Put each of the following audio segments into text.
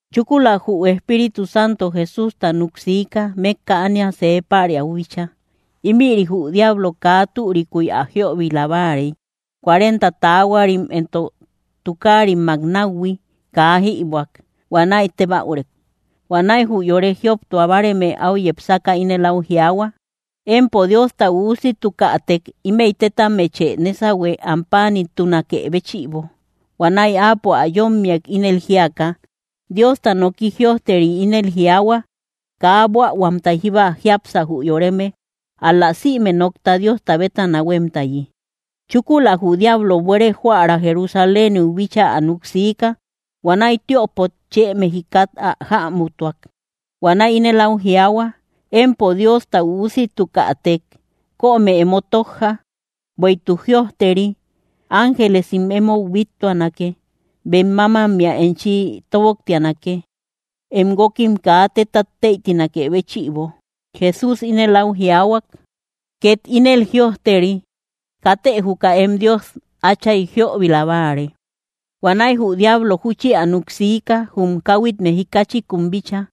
Chúkula jü Espíritu Santo Jesústa núk siika, mékka ánia see päriau bíchaa. Ímïri jü diablo kaa türikuy ä jíöbila báarey. Cuarenta taahuarim entok tukaarimmak náuhui kaa jïbuäk; huanäi tébäurek. Huanäi jü yore jioptua báreme áu yepsaka ínel áu jiaahua: —Empo Diosta Üusitukätek, ímëi tétammechë nésahue, am páanimtunakë béchïbo. Huanäi Áapo ä yómmiak, ínel jíaka: —Diosta nooki jïojteri ínel jiaahua: “Kaa buähuamtay jíba jiápsa, jü yoreme, ál‑la sïme nokta Diosta bétana huémtayi.” Chúkula jü diablo buere joära Jerusaléniu bíchaa ä núk siika. Huanäi tiöpot chë mejikat ä jämutuak. Huanäi ínel áu jiaahua: —Empo Diosta Üusitukätek, kömë emo tójja. Bueïtuk jïojteri: Ángelesim emou bíttuanake; bem mámammea enchi tóboktianake, em guókim kaa tétat tëitinakë béchïbo. Jesús ínel áu jiaahua: —Két ínel jïojteri: “Katë juka em Dios Átchay jíöbila báare.” Huanäi jü diablo júchi ä núk siika, jum káhuit mejikachikun bíchaa.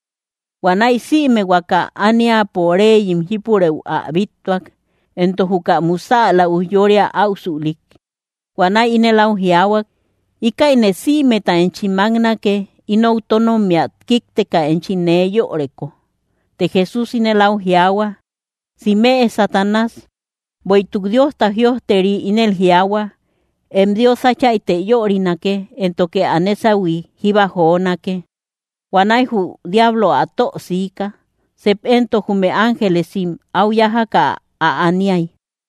Huanäi sïme huaka ániapo réyim jípureu ä bíttuak, entok juka musäla ujyória áusülik. Huanäi ínel áu jiaahuak: —Íkäine sïmeta enchi máknake, inou tónommia kíkteka enchi nee yöreko. Të Jesús ínel áu jiaahua: —¡Simëe, Satanás! Bueïtuk Diosta jïojteri ínel jiaahua: “Em Dios Áchaytë yörinake, éntoke ä nésahui jíba jonake.” Huanäi jü diablo ä tö siika. Sep éntok jume ángelesim áu yájaka ä aniay.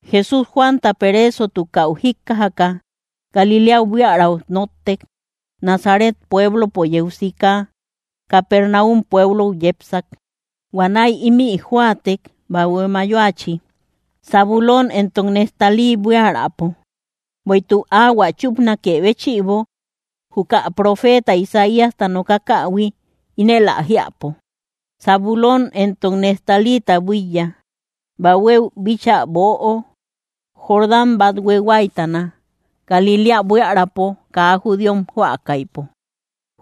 Jesús, Juanta pereesotukäu jíkkajaka, Galiléau buiaräu nóttek. Nazaret pueblopo yeu sika, Capernáum pueblou yepsak. Huanäi ímï jóatek, bahue mayoachi, Zabulón entok Neftalí buiärapo. Bueïtuk áhuä chúpanakë béchïbo, juka profeeta Isaíasta nokakähui, ínel ä jiäpo: Zabulón entok Neftalíta buíya, bahuéu bíchaa böo, Jordán bathue huáytana, Galiléa buiärapo kaa judíom jóakaïpo.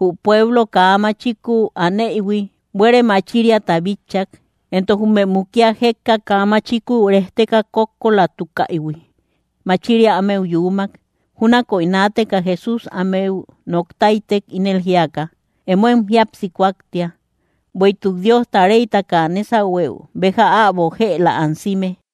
Jü pueblo kaa machikuu aneïhui, buere machiriata bitchak; entok jume mukia jékka kaa machikuu rejteka kókkolatukaïhui, machiria ámeu yuumak. Júnaköi naateka Jesús ámeu nok táytek, ínel jíaka: —Emóem jíapsi kúaktia, bueïtuk Diosta réytaka nésahueu béja äbo jëla ansime.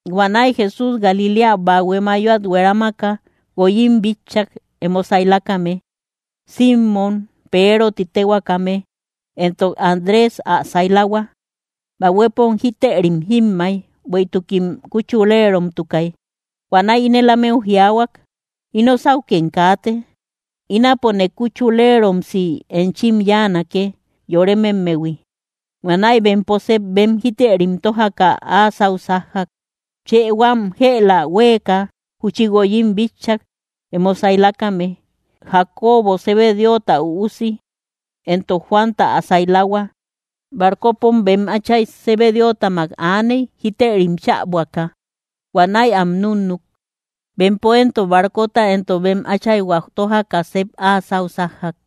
Huanäi Jesús Galiléa bahue mayoat hueramaka, guoyim bitchak emo sailakame: Simmom, Peero ti téhuakäme, entok Andrés ä sailahua. Bahuepom jítërim jímmay, bueïtukim kuchuleromtukay. Huanäi ínel ámeu jiaahuak: —Ino sáukem kaate; ínapone kuchuleromsi enchim yáanake, yorememmehui. Huanäi bempo sep bem jítërim tójaka, áa sáu sájjak. Chë huam jëla huéeka, júchi guoyim bitchak, emo saylakame: Jacobo Zebedeota üusi, entok Juanta ä saylahua. Barcopom bem áchay Zebedeotamak aaney, jítërim chäbuaka. Huanäi am núnnuk. Bempo éntok barcota entok bem áchayhua tójaka, sep áa sáu sájjak.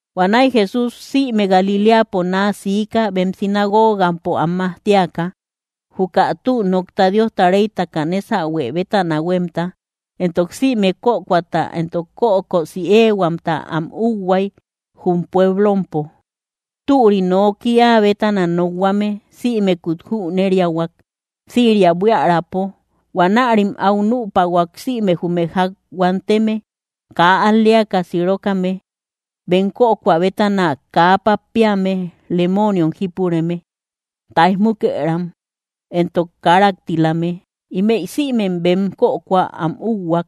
Huanäi Jesús sïme Galiléapo naa siika, bem sinagogampo am majtiaka, juka tü nokta Diosta réytaka nésahue bétana huémta, entok sïme kökoata entok kökosi éehuamta am úhuay, jum pueblompo. Türi nooki áa bétana nokhuame sïmekut jüneriahuak, Siria buiärapo. Huanärim áu nüpahuak sïme jume ják huanteme, kaa al‑leaka sirokame bem kökoa bétana, kaa pappeame, lemooniom jípureme, táij múkëram, entok káraktilame. Ímëi sïmem bem kökohua am úhuak.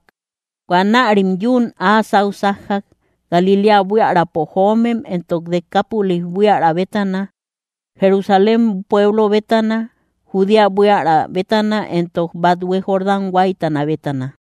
Huanärim yuun áa sáu sájjak, Galiléa buiärapo joomem, entok Decápolis buiära bétana, Jerusalén pueblo bétana, Judea buiära bétana, entok bathue Jordán huáytana bétana.